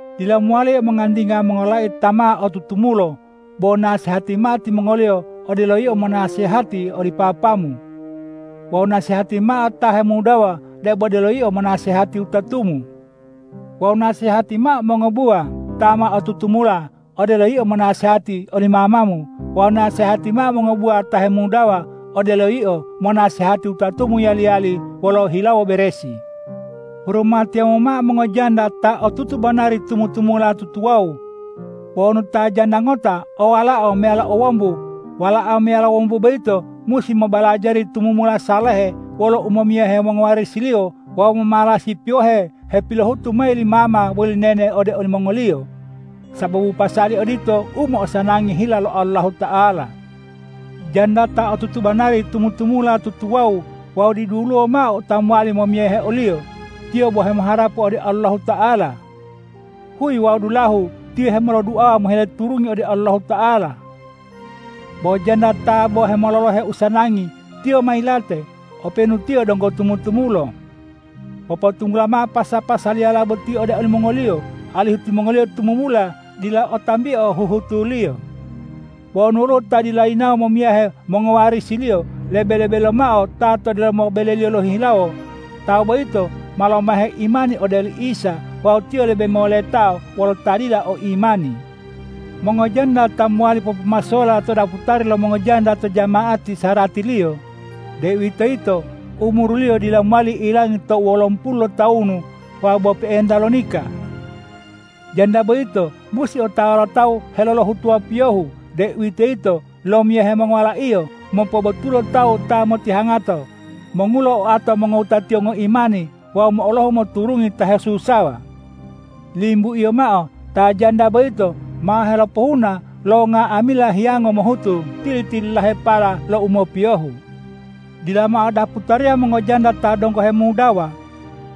Dila mowali yio mongantinga mongololai ta ma otutumulo, bo nasehati mao timongoliyo odelo yio monasehati oli papamu. Wawu nasehati mao ta hemudawa debo odelo yio monasehati wutatumu. Wawu nasehati mao mongobuwa ta ma otutumula odelo yio monasehati oli mamamu wawu nasehati mao mongobuwa ta hemudawa odelo yio monasehati wutatumu yali-yali wolo hilawo beresi. Hurumatiyamu mao mongojanda ta otutu banari tumu-tumula tutuwawu. Bo wonu ta janda ngota o walao meyalo o wombu, walao meyalo wombu boyito musi mobalajari tumumula salehe wolo umomiyahe mongowarisiliyo wawu momalasi piyohe hepilohutu mayi li mama woli nene ode olimongoliyo. Sababu pasali odito u mo'osanangi hila lo Allahuta'ala. Janda ta otutu banari tumu-tumula tutuwawu wawu diduluwo mao ta mowali momiyahe oliyo, tiyo bo hemoharapu ode Allahuta'ala. Huyi wawu dulahu tiyo hemoloduawa mohile turungi ode Allahuta'ala. Bo janda ta bo hemololohe usanangi tiyo ma yilate, openu tiyo donggo tumu-tumulo. Popotunggula mao pasa-pasaliyala boti ode olimongoliyo, alihu timongoliyo tumumula dila o tambio huhutuliyo. Bo wonu woluwo ta dila yinawo momiyahe mongowarisiliyo lebe-lebe lomao ta to delomo beleliyo lohihilawo, tawu boyito ma lomahe imani ode oli Isa wawu tiyo lebe moletao wolo ta dila o imani. Mongojanda ta mowali popomasola to daputari lo mongojanda to jama'ati saratiliyo, deuwitoyito umuriliyo dila mowali ilangi tou wolomo pulu lotawunu wawu bo pe'enta lo nika. Janda boyito musi otawa lo tawu helolohutuwa piyohu, deuwitoyito lomiyahe mongowalaiyo, mopobotulo tawu ta motihangato, mongulo oato mongowutatiyo ngoimani wawi mo'olohu moturungi ta hesusawa. Limbuiyo mao ta janda boyito ma helopohuna lo nga'amila hiyango mohutu tili-tililahepala lo u mopiyohu. Dila mao daputariya mongojanda ta donggo hemudawa.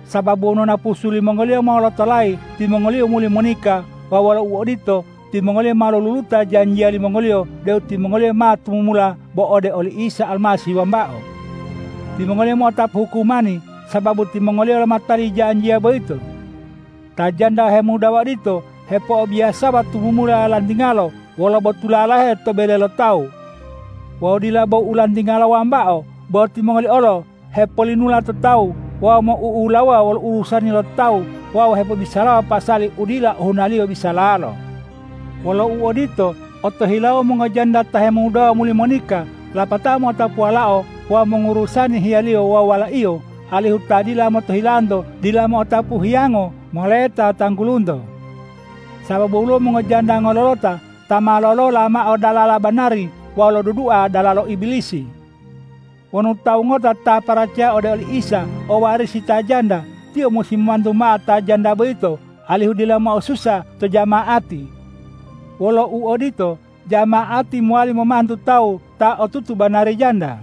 Sababu wonu napusu limongoliyo molotolayi, timongoliyo muli monika wawu wolo uodito, timongoliyo ma loluluta janjiya limongoliyo deu timongoliyo ma tumumula bo ode oli Isa Almasih wambao. Timongoliyo mo'otapu hukumani sababu timongoliyo lomatali janjiya boyito. Ta janda hemudawa odito hepo'obiyasawa tumumula lantingalo wolo botula lahe to bele lo tawu. Wawu dila bo u lantingala wambao, bo timongoliyo olo hepolinula to tawu wawu mou'ulawuwa wolo urusani lo tawu wawu hepobisalawa pasali u dila ohunaliyo bisalalo. Wolo uodito, otohilau mongojanda ta hemudawa muli monika lapatao mo'otapu walao wawu mongurusani hiyalo wawu walaiyo, alihu ta dila motohilanto dila mo'otapu hiyango moleta tanggulunto. Sababu woluwo mongojanda ngololota ta ma lolola mao dalala banari wawu lodudua dalalo Ibilisi. Wonu tawu ngota ta paracaya ode oli Isa o warisi ta janda, tiyo musi momantu mao ta janda boyito, alihu dila mo'osusa to jama'ati. Wolo uodito jama'ati, mowali momantu tawu ta otutu banari janda.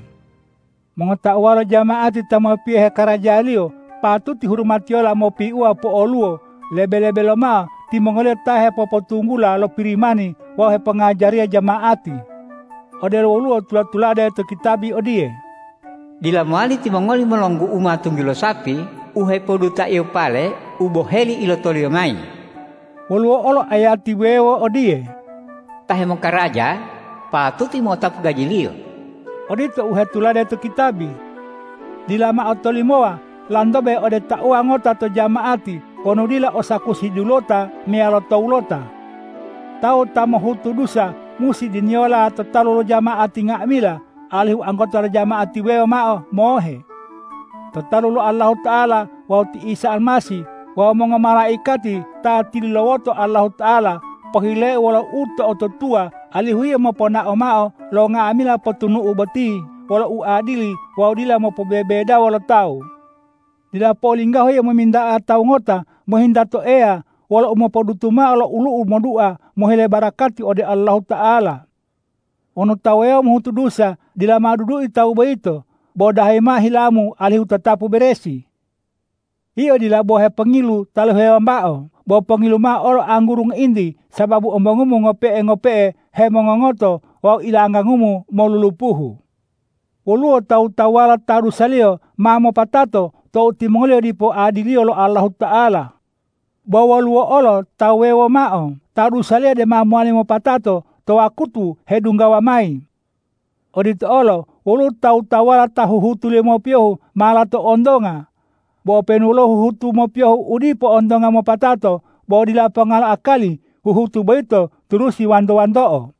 Mongotauwa lo jama'ati ta mopiyohe karajaliyo, patuti hurumatiyola mopiu po'oluwo, lebe-lebe lomao timongoliyo ta hepopotunggula lo Pirimani wawu hepongajariya jama'ati. Odelo woluwo tula-tulade to kitabi odiye,”Dila mowali timongoli molonggu'uma tunggilo sapi u hepodutaiyo pale u boheli ilotoliyo mayi.” Woluwo olo ayati wuwewo odiye,”Ta hemokaraja patuti mo'otapu gajiliyo.” Odito u hetulade to kitabi. Dila mao tolimowa lantobe ode tauwa ngota to jama'ati wonu dila o sakusi dulota meyalo towulota. Tawu ta mohutu dusa musi diniyola to talu lo jama'ati nga'amila, alihu anggota lo jama'ati wuwewo mao mohe. To talu lo Allahuta'ala wawu ti Isa Almasih wawu mongomalaikati ta tilulawoto Allahuta'ala, pohileu wolo u to'otutuwa alihu yio moponao mao lo nga'amila potunu'u boti wolo uadili wawu dila mopobebedawo lo tawu. Dila po'olinggahu yio mominta'a tawu ngota mohinta to Eya wolo umopodutu mao lo olu'u modua mohile barakati ode Allahuta'ala. Wonu tawu wuwewo mohutu dusa, dila mao dudui tawu boyito, bo dahayi mao hilamu alihu tatapu beresi. Yio dila bo hepongilu taluhe wambao, bo pongilu mao olo angguru ngointi, sababu ombongumu ngope'e-ngope'e hemongongoto wawu ilanggangumu molulupuhu. Woluwo tawu-tawuwala ta dusaliyo ma mopatato tou timongoliyo dipo adiliyo lo Allahuta'ala; bo woluwo olo tawu wuwewo mao ta dusaliyo dema mowali mopatato to wakutu hedunggawa mayi. Odito olo woluwo tawu-tawuwala ta huhutuliyo mopiyohu ma lato ontonga; bo openu woluwo huhutu mopiyohu u dipo ontonga mopatato, bo dila ponga lo akali huhutu boyito turusi wanto-wanto'o.